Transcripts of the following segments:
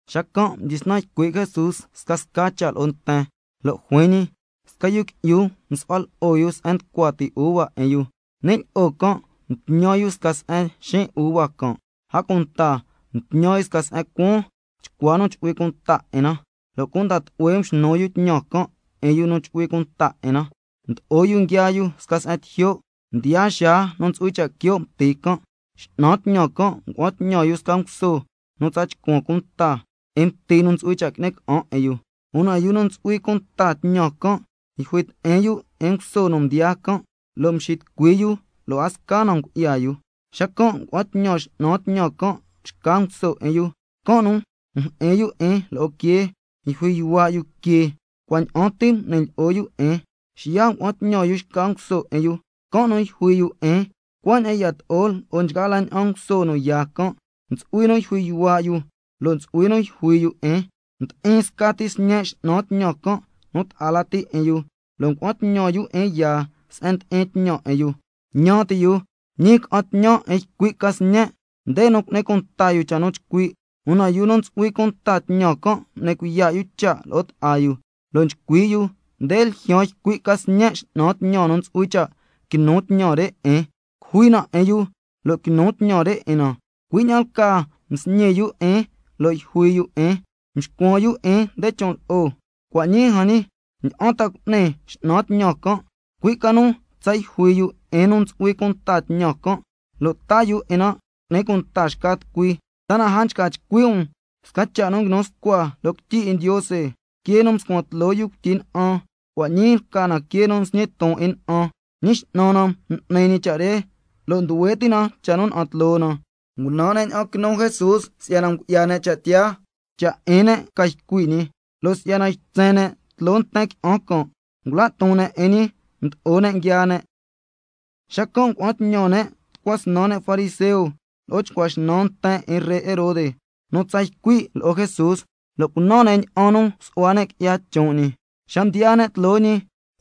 Xacan' mdyisnan ycui' Jesús scasca cha' lo'o nten, lo' juin ñi: Sca yu qui'yu msu'hua lo'o yu se'en nducua ti uva 'in yu. Ni' lyi'o can' mtñan yu sca se'en xiin' uva can'. A cunta mtñan yu sca se'en cuaan, chcua nu chu'hui cunta 'in na, lo' cunda tlu'hue mxnu yu tñan can' 'in yu nu chu'hui cunta 'in na, mdo'o yu nguiaa yu sca se'en tijyo'. Mdiyaa xaa nu ntsu'hui cha' quio' mti can', x'nan tñan can' ngua'an tñan yu sca nguso nu tsa chcuan cunta 'in mti nu ntsu'hui cha' qui'ni ca'an 'in yu. Una yu nu ntsu'hui cunta tñan can' yjui ti'in yu 'in nguso nu mdiyaa can', lo' mxitucui yu lo' a sca na ngu'ya yu. Xacan' ngua'an tñan x'nan tñan can' xca nguso 'in yu, can' nu mjyi'in yu 'in lo'o quee, yjui yuhua' yu que, cua' ña'an ti m'ni lyi'o yu 'in. Xiya' ngua'an tñan yu xca nguso 'in yu, can' nu yjui yu 'in. Cuaña'an yato'o lo'o nchgaa la ña'an nguso nu yaa can', ntsu'hui nu yjui yuhua' yu, lo' ntsu'hui nu yjui yu 'in. Ndi'in scati sñe' x'nan tñan can' nu ta'a la ti' 'in yu, lo' ngua'an tñan yu 'in yaa se'en ndi'in tñan 'in yu. Ñan ti' yu: Ñii ca'an tñan 'in ycui' ca sñe', nde nu cu'ni cunta yu cha' nu chcui'. Una yu nu ntsu'hui cunta tñan can', mdyisnan m'ni cuiya' yu cha' lo'o ta'a yu, lo' nchcui' yu: Nde ljyaan ycui' ca sñe' x'nan tñan nu ntsu'hui cha' quinu tñan re 'in, cujui na 'in yu lo' quinu tñan re 'in na. Cui' ña'an lcaa msñi yu 'in lo' yjui yu 'in, mscuan yu 'in nde chon' lo'o. Cua' ñii jan ñi, ¿ña'an ta cu'ni x'nan tñan can'? Cui' ca nu tsa yjui yu 'in yu nu ntsu'hui cunta tñan can', lo' taa yu 'in na cu'ni cunta xca tucui. ¿Ta a nchca chcui' um sca cha' nu nguinu scua loo quityi 'in Ndiose: —Quee nu mscuan tloo yu cuityi na'an, cua' ñii lca na quee nu nsñi ton 'in na'an. Ñi X'nan na m'ni ñi cha' re, lo' nduhue ti' na cha' nu na'an tloo na—? Ngunan ne' ña'an quinu Jesús si'yana ngu'ya ne' cha' tiyaa, cha' 'in ne' ca ycui' ñi. Lo' si'yana nguitsen ne' tloo nten qui'an can', ngula' ton ne' 'in ñi, mdo'o ne' nguiaa ne'. Xacan' ngua'an tñan ne' tucua snan ne' fariseo, lo'o chcua xnan nten 'in ree Herode nu tsa ycui' lo'o Jesús, lo' cunan ne' ña'an nu su'hua ne' qui'ya chon' ñi. Xa mdiyaa ne' tloo ñi,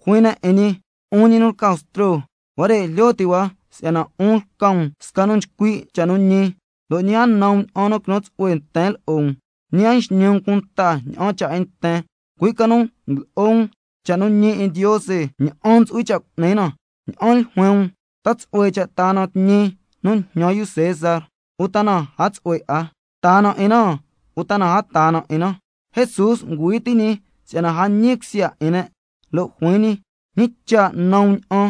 juin ne' 'in ñi: 'Un ñi nu lca Bstro, huare' jlyo ti' hua si'yana 'un lca um sca nu nchcui' cha' nu ñi, lo' ñi a nan um ña'an nu quinu tsu'hue nten lo'o um, ñi a nxñi um cunta ña'an cha' 'in nten, cui' ca nu ndlo'o um cha' nu ñi 'in Ndiose, ña'an ntsu'hui cha' cu'ni na. Ña'an ljuin um, ¿ta tsu'hue cha' taa na tñi nu njñan yu César, uta na a tsu'hue 'a? ¿Taa na 'in na, uta na a taa na 'in na? Jesús ngüi ti' ñi si'yana a ñi cusya 'in ne', lo' juin ñi: ¿Ñi cha' nan um ña'an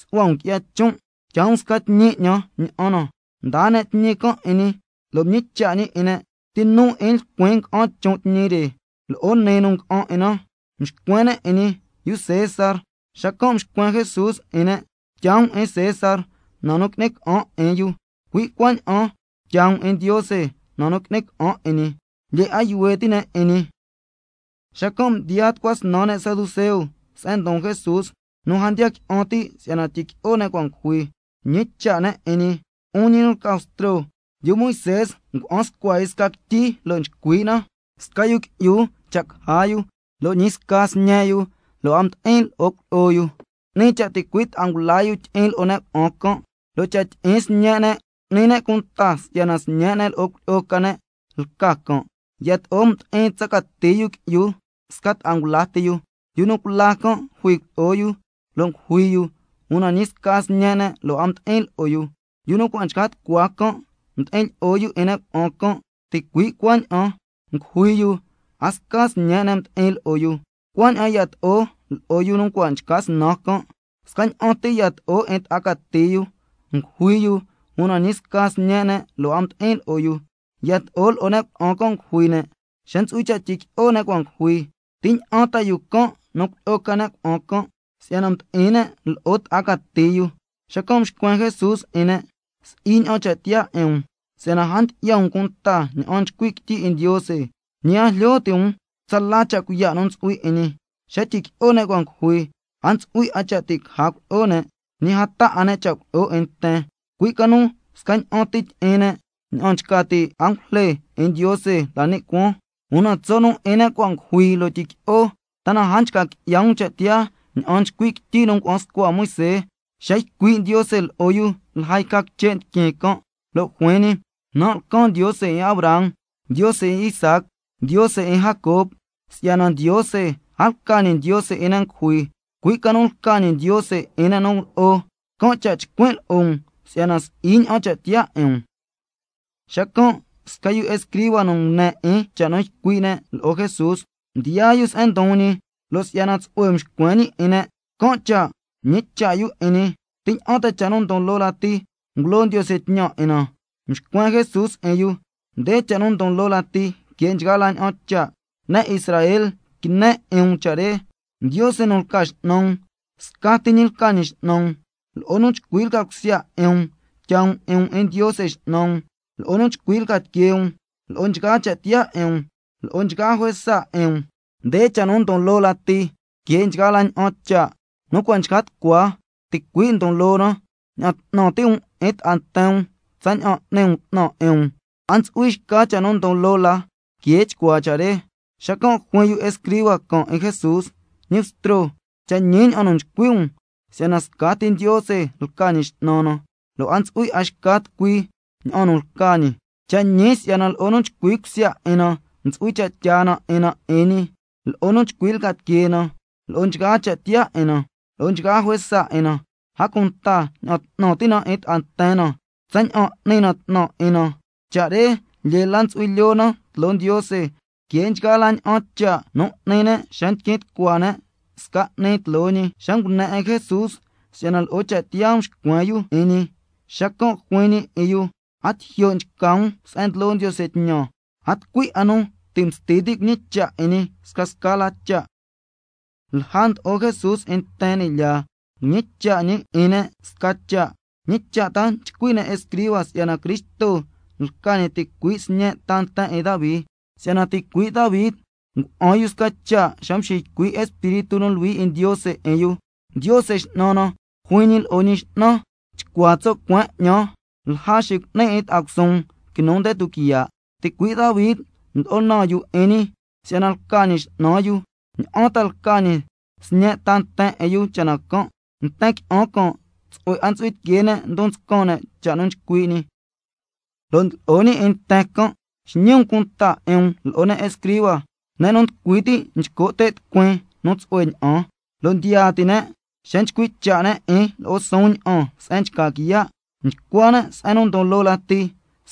su'hua um qui'ya chon'? Tyaa um sca tñi 'ñan, ña'an na. Mdaa ne' tñi can' 'in ñi, lo' mñicha' ñi 'in ne': ¿Ti nu 'in lcuin nga'an chon' tñi re, lo'o nii nu nga'an 'in na? Mxcuen ne' 'in ñi: Yu César. Xacan' mxcuen Jesús 'in ne': Tyaa um 'in César na nu qui'ni ca'an 'in yu, cui' cuaña'an tyaa um 'in Ndiose na nu qui'ni ca'an 'in ñi. Lyee 'a yuhue ti' ne' 'in ñi. Xacan' mdiyaa tucua snan ne' saduceo se'en ndon Jesús nu a ndiya qui'an ti' si'yana tyiqui'o ne' cua' ngujui. Mñicha' ne' 'in ñi: 'Un ñi nu lca Bstro, yu Moisé ngua'an scua yu sca quityi lo' nchcui' na: —Sca yu qui'yu cha' caja yu, lo' ñi sca sñe' yu lo' a mdi'in lo'o cuilyi'o yu, 'ni cha' ticui' ta'a ngula yu tyi'in lyi'o 'in ne' cuna'an can', lo' cha' tyi'in sñe' ne' cu'ni ne' cunta si'yana sñe' ne' lo'o cuilyi'o ca ne' lca can'—. Yato'o mdi'in tsa cati yu qui'yu sca ta'a ngula ti yu. Yu nu cula can' jui cuilyi'o yu, lo' ngujui yu, una ñi sca sñe' ne' lo' a mdi'in lo'o yu. Yu nu cua' nchca tucua can' mdi'in lyi'o 'in ne' cuna'an can', ticui' cuaña'an ngujui yu, a sca sñe' ne' mdi'in lo'o yu. Cuaña'an yato'o lo'o yu nu cua' nchca snan can'. Scaña'an ti yato'o 'in ta'a cati yu, ngujui yu, una ñi sca sñe' ne' lo' a mdi'in lo'o yu. Yato'o lo'o ne' cuna'an can' ngujui ne'. Xa ntsu'hui cha' tyiqui'o ne' cua' ngujui, ¿ti ña'an ta yu can' nu cuilyi'o ca ne' cuna'an can', si'yana mdi'in ne' lo'o ta'a cati yu? Xacan' mxcuen Jesús 'in ne': Si'i ña'an cha' tiyaa 'in um, si'yana a ndyi'ya um cunta ña'an nchcui' quityi 'in Ndiose, ñi a jlyo ti' um tsala cha' cuiya' nu ntsu'hui 'in ñi. Xa tyiqui'o ne' cua' ngujui, a ntsu'hui 'a cha' ti' caja cuilyi'o ne', ñi a taa 'a ne' cha' cuilyi'o 'in nten, cui' ca nu scaña'an ti tyi'in ne' ña'an nchca ti' angujle 'in Ndiose la ni' cuaan. Una tso' 'in ne' cua' ngujui lo' tyiqui'o, ¿ta na a nchca qui'ya um cha' tiyaa ña'an nchcui' quityi nu ngua'an scua Moisé, xa ycui' Ndiose lo'o yu lja yca quiche' ndiquin can', lo' juin ñi: —Nan' lcan Ndiose 'in Abraham, Ndiose 'in Isaac, Ndiose 'in Jacob—? Si'yana Ndiose a lca ñi Ndiose 'in ne' ngujui, cui' ca nu lca ñi Ndiose 'in ne' nu lo'o. Can' cha' nchcuin' lo'o um si'yana si'i ña'an cha' tiyaa 'in um. Xacan' sca yu escriba nu ngune 'in cha' nu ycui' ne' lo'o Jesús, mdiyaa yu se'en ndon ñi. Lo' si'yana tsu'hue mxcuen ñi 'in ne', can' cha' mñicha' yu 'in ñi: ¿Ti ña'an ta cha' nu ndon loo lati ngulo Ndiose tñan 'in na? Mxcuen Jesús 'in yu: Nde cha' nu ndon loo lati que nchgaa la ña'an cha': —Ne' Israel quine 'in um cha' re. Ndiose nu lca X'nan um, scati ñi lca ñi X'nan um. Lo'o nu chcui lca cusya 'in um tyaa um 'in um 'in Ndiose X'nan um, lo'o nu chcui lca tiquee um—, lo'o nchgaa cha' tiyaa 'in um, —lo'o nchgaa juesa 'in um—. Nde cha' nu ndon loo lati que nchgaa la ña'an cha'. Nu cua' nchca tucua ticui' ndon loo na: —Ña'an 'tnan ti' um 'in ta'a nten um tsaña'an n'ni um 'tnan 'in um—. A ntsu'hui xca cha' nu ndon loo la que chcuaa cha' re. Xacan' juin yu escriba can' 'in Jesús: Ñi Bstro, cha' ñi ña'an nu nchcui' um si'yana scati Ndiose lca Ñi X'nan na, lo' a ntsu'hui 'a xca tucui ña'an nu lca ñi. Cha' ñi si'yana lo'o nu chcui cusya 'in na ntsu'hui cha' tyaa na 'in na 'in ñi, lo'o nu chcui lca tiquee na, lo'o nchgaa cha' tiyaa 'in na, lo'o nchgaa juesa 'in na. A cunta ña'an 'tnan ti' na 'in ta'a nten na tsaña'an n'ni na 'tnan 'in na. Cha' re lyee la ntsu'hui lyoo na tloo Ndiose que nchgaa la ña'an cha' nu ngui'ni ne' xa ndiquin tucua ne' sca 'ni tloo ñi. Xa ngune 'in Jesús si'yana lo'o cha' tiyaa mxcuen yu 'in ñi, xacan' juin ñi 'in yu: A tijyo' nchca um se'en ndlo Ndiose tñan. A tucui 'a nu ti' msti ti' cuñicha' 'in ñi scasca la cha'. Lja ndlo'o Jesús 'in nten ni' lyaa, mñicha' ñi 'in ne' sca cha': ¿Ñi cha' ta nchcui' ne' escriba si'yana Cristo lca ñi ticui' sñe' ta nten 'in Davi? Si'yana ticui' Davi ngua'an yu sca cha' xa mxiycui' Espíritu nu Luhui 'in Ndiose 'in yu: —Ndiose X'nan na juin ñi lo'o Ñi X'nan: Chcua tso' cueen 'ñan lja xicu'nin 'in ta'a cusuun quinu nde tuquiya'—. Ticuii' Davi ndlo'o naan yu 'in ñi si'yana lca ñi X'nan yu, ¿ña'an ta lca ñi sñe' ta nten 'in yu cha' na can'? Nten qui'an can' tsu'hue 'a ntsu'hui tiquee ne' ndon nscan ne' cha' nu nchcui' ñi. Lo' ndlo'o ñi 'in nten can': Xñi um cunta 'in um lo'o ne' escriba, ne' nu nducui ti' nchco' te' tucuin nu tsu'hue ña'an, lo' ndiya ti' ne' xa nchcui' cha' ne' 'in lo'o suun ña'an se'en nchca quiya'. Nchcua ne' se'en ndon loo lati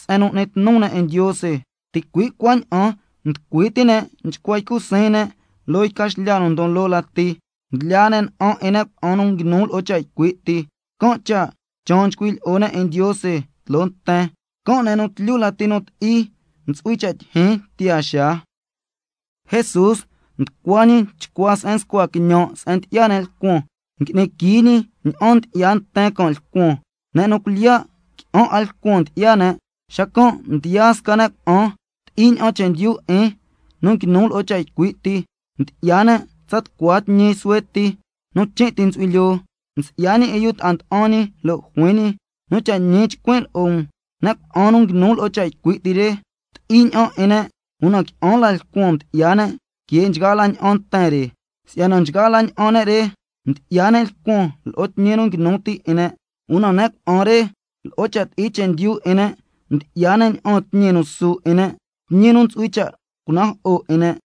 se'en nu n'ni tnu ne' 'in Ndiose, ticui' cuaña'an nducui ti' ne' nchcua ycu siin ne' loo yca xlya nu ndon la loo lati. Ndlyaa ne' na'an 'in ne' cuna'an nu nguinu lo'o cha' ycui' ti, can' cha' chaan nchcui' lyi'o ne' 'in Ndiose tloo nten, can' ne' nu tlyu lati nu ti'i ntsu'hui cha' tyijyin tiyaa xaa. Jesús nducua ñi chcua se'en nscua quiñan' se'en ndyi'ya ne' lcuan, ngui'ni quii ñi ña'an ndyi'ya nten can' lcuan. Ne' nu cuilyiya' qui'an 'a lcuan ndyi'ya ne'. Xacan' mdiyaa sca ne' cuna'an ti'i ña'an chendyu 'in nu nguinu lo'o cha' ycui' ti, mdyi'ya ne' tsa tucua tñi suhue ti, nu chin' ti ntsu'hui lyoo. Mxi'ya ñi 'in yu ta'a nda'an ñi, lo' juin ñi: Nu cha' ñi chcuin' lo'o um, ne' cuna'an nu nguinu lo'o cha' ycui' ti re, ti'i ña'an 'in ne', una qui'an la lcuan mdyi'ya ne' que nchgaa la ña'an nten re. Si'yana nchgaa la ña'an ne' re, mdyi'ya ne' lcuan lo'o tñi nu nguinu ti 'in ne'. Una ne' cuna'an re, lo'o cha' ti'i chendyu 'in ne' mdyi'ya ne' ña'aan tñi nu su 'in ne', tñi nu ntsu'hui cha' cunajo'o 'in ne'.